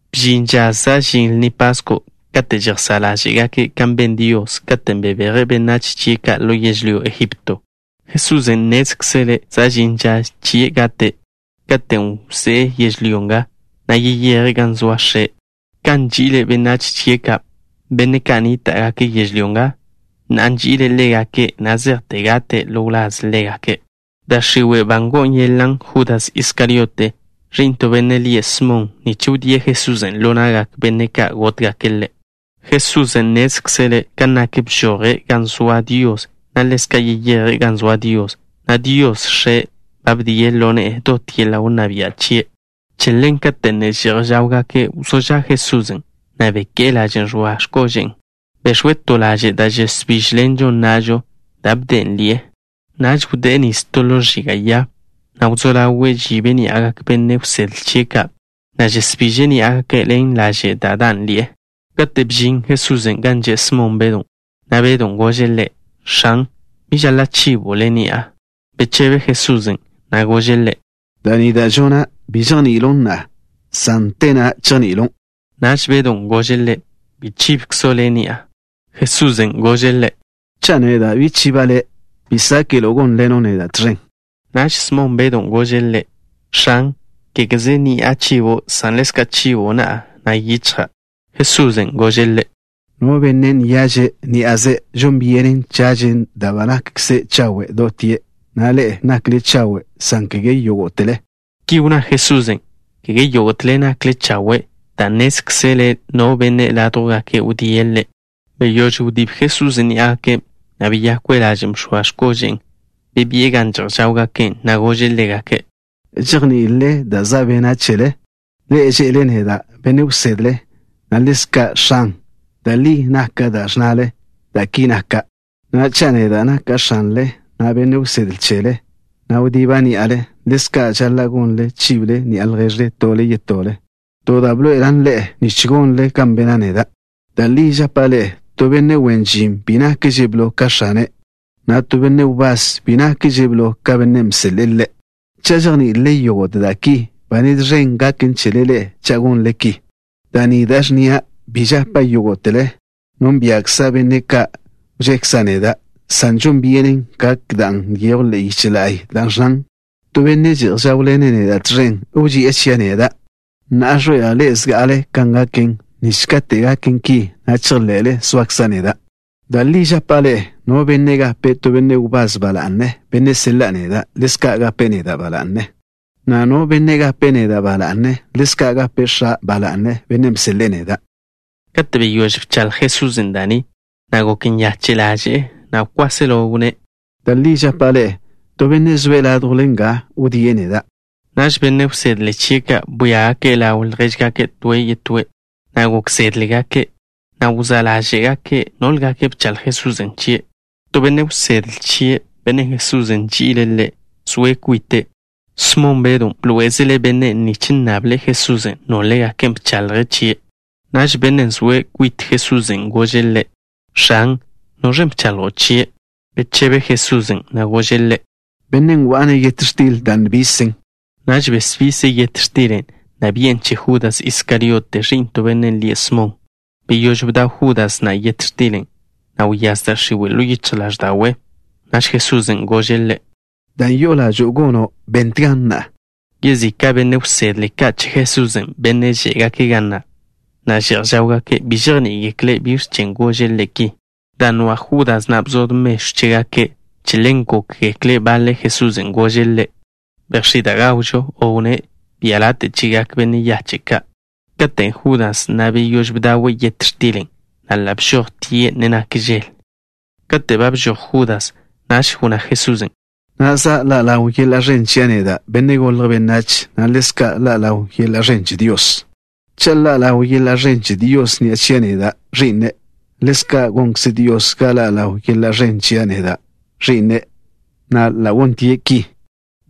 Bžin ža za' žin Lni Pasko' kate' žejsá' ḻáže'gake' kan ben Dios, katen' bebeje' benách chie' ka' ḻo yežlyó Egipto. Jesusen' nnézkzele' za' žin ža chie' gate', katen' wzé'e yežlyó nga, na' yeyeje' gan zoa X̱e'. Kan nži'ile' benách chie' ka', benne' ka' nníta'gake' yežlyó nga, na'a nži'ile' ḻégake' na' zejte gate' ḻo wláz ḻégake'. Da' x̱iwe' ba ngo'o yeḻan' Judas Iskariote, ẕi'n to benne' lie' Smon, nich wdíe' Jesusen' ḻo na'gak benne' ka' gótgake' Ḻe'. Jesusen' nnézkzele' kan nak, bžoje' gan zoa Dios, na' yeyeje' gan zoa Dios, na' Dios, X̱e', ba bdie' ḻo ne'e Ḻe' dot yeḻa' wnná bia' chie'. Che ḻen, kate' ne že'j žáwgake', wzó ža' Jesusen', na' beké'e lažen' žx̱oa x̱kože'e. Bex̱we' to laže' da' žesbížḻenžon na'žo, da' bde'en ḻi'e. Naž wdé'e nis to ḻo ẕiga' ya, na' wzó ḻawe' žibe' ní'agak benne' wsedle chie' ka', na' žesbiže' ní'agake' ḻen lažen' da' dan' ḻi'e. Kate' bžin Jesusen' gan že' Smon Bedw, Bedon' gože' Ḻe': —X̱an, bi žaḻa' chibo' Le' ni'a. Bechebe Jesusen', na' gože' ḻe': —Da' ni da' žona', bi žejni'ilon' na'a, san te na'a chejni'ilon'. Naž Bedon' gože' Ḻe': —Bi chibkzo' Le' ni'a. Jesusen' gože' ḻe': —Cha' neda' bi chiba' le', bi sáke'lo' gónḻeno' neda' tẕen. Naž Smon Bedon' gože' Ḻe': —X̱an, kégeze ni'a chibo', san ḻezka' chibo' na'a, na' yichja'. Jesusen' gože' ḻe': —No benne' nyaže', ní'aze' žon byenen chažen, dan' ba nakkze' chawe' dotie', na' ḻe'e nakle chawe', san kege yógo'tele. Ki wnná Jesusen': “Kege yógo'tele nakle chawe'” dan' nnézkzele' no benne' ládjwgake' wdíe' Ḻe'. Beyóž wdíb Jesusen' ní'agake', na' beyakwe' lažen' bx̱oa x̱kože'e. Bebi'e gan že'j žáwgake', na' gože' ḻégake': —¿Žejní'ilele dan' za' bena' chele? Ḻe'e že'le neda': “Benne' Wsedle” na': “X̱an.” Da' li nak da' ẕnnale, dan' ki naka'. Na'a, cha' neda' naka' X̱anle, na' Benne' Wsedle chele, na' wdiba' ní'ale, ḻezka' žaḻa' gonle ḻe'e, chible ni'a lježle tole yetole. To da' bḻoe'elan' ḻe'e nich gonle ḻe'e kan bena' neda'. Da' li žapa' ḻe'e: to benne' wen žin bi nakže' blo ka X̱ane', na' to benne' wbás bi nakže' blo ka bennen' bseḻe'e ḻe'. Cha' žejní'ilele yógo'te da' ki, ba nez ẕen gaken chele ḻe'e cha' gonle ki. Da' ni da' ẕnnia' bi žapa' yógo'tele. Nónbia'kza' benne' ka' wžekza' neda', san žon byenen gak dan' nyejwn ḻe'e yiche la'y, dan' ẕnnan: “To benne' že'j žáwḻene' neda' tẕen wži'e chia' neda'.” Na'a ẕḻoe'ela' ḻe'e zga'ale kan gaken, nich katen' gaken ki, na' chejḻe'le zoakza' neda'. Da' li žapa' ḻe'e: no benne' gape' to benne' wbás ba la'ne, benne' seḻa'a neda', ḻezka' gape' neda' ba la'ne, na' no benne' gape' neda' ba la'ne, ḻezka' gape' X̱a' ba la'ne, Bennen' bseḻe'e neda'. Kate' beyóž bchaḻj Jesusen' da' ni, gok nyache' ḻaže'e, na' kwáselo wnné': —Da' li žapa' ḻe'e: to benne' zoe' ládjwle ḻe'e nga wdíe' neda'. Naž benne' wsedle chie' ka' bwíagake' ḻaw ljéžgake' toe' yetóe', na' gok zédgekle', na' wzá' ḻáže'gake' nólegake' bchaḻj Jesusen' chie'. To benne' wsedle chie', bennen' Jesusen' nži'ile' ḻe', zoe' kwite'. Smon Bedw bḻoé'ezele' bennen' nich nnable' Jesusen' nólegake' bchaḻje' chie'. Naž bennen' zoe' kwit Jesusen' gože' Ḻe': —X̱an, ¿noẕen' bchaḻjo' chie'? Bechebe Jesusen', na' gože' ḻe': —Bennen' wa'a-ne' yet x̱til da' nbisen. Naž besbise' yet x̱tilen', na' bi'en che Judas Iskariote, ẕi'n to benne' lie' Smon. Beyóž bdaw Judas na' yet x̱tilen', wyáz da' x̱iwe' ḻo yichj ḻáẕda'we'. Naž Jesusen' gože' ḻe': —Dan' yo'o ḻažo'o gono', bentgan na'a. Yezika' benne' wsedle ka' che Jesusen', benne' žé'gake' ga na', na' že'j žáwgake', bi žejní'igekle' biẕ chen' gože' ḻe' ki. Dan' nwa' Judas na' bzod mežw chégake', che ḻen gókgekle' baḻe' Jesusen' gože' ḻe': “Bejx̱í' da' gawžo” o wnné': “Bia' late' chegak benne' yache' ka'.” Katen' Judas na' beyóž bdawe' yet x̱tilen', na' ḻa' bžojtie', ne nak žel. Kate' ba bžoj Judas, wnná Jesusen': —Na'a za' ḻa' ḻaw yeḻa' ẕen chia' neda', Benne' Golje' Benách, na' ḻezka' ḻa' ḻaw yeḻa' ẕen che Dios. Cha' ḻa' ḻaw yeḻa' ẕen che Dios ni'a chia' neda', Ẕi'ne', ḻezka' gonkze Dios ga ḻa' ḻaw yeḻa' ẕen chia' neda', Ẕi'ne', na' ḻa' gontie' ki.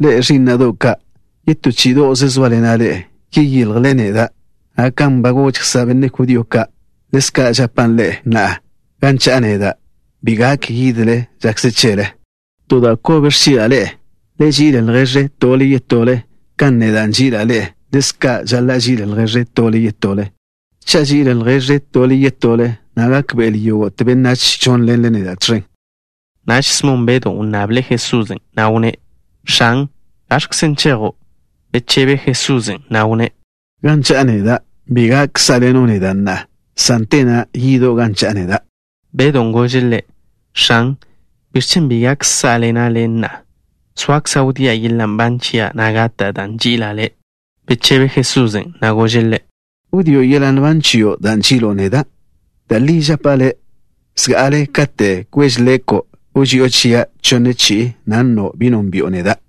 Ḻe'e, ẕí'na'do' ka', yetó chí'ido'ze zóaḻena' ḻe'e. Yeyiljle neda', na' kan ba goža' benne' judío ka', ḻezka' žapa' ḻe'e na'a: gan cha'a neda', bi gak yidle žakze chele. To da' kobe ẕchi'la' ḻe'e: le ži'il lježle tole yetole. Kan neda' nži'ila' ḻe'e, ḻezka' žaḻa' ží'ilele lježle tole yetole. Cha' ží'ilele lježle tole yetole, gékbe'egekle yógo'te benách žónḻenle neda' tẕen. Naž Smon Bedw wnnable' Jesusen', na' wnné': —X̱an, ¿gaẕkzen' chejo'? Bechebe Jesusen', na' wnné': —Gan cha'a neda', bi gak sá'ḻeno' neda' na'a, san te na'a yido' gan cha'a neda'. Bedon' gože' Ḻe': —X̱an, ¿biẕ chen' bi gak sá'ḻena' Le' na'a? Zoakza' wdía' yeḻa' nban chia', na' gata' dan' nži'ila' Le'. Bechebe Jesusen', na' gože' ḻe': —¿Wdío' yeḻa' nban chio' dan' nži'ilo' neda'? Da' li žapa' le', zga'ale kate' kweže leko', wži'o chia' chonne chi'i, na' nno' bi nónbi'o neda'.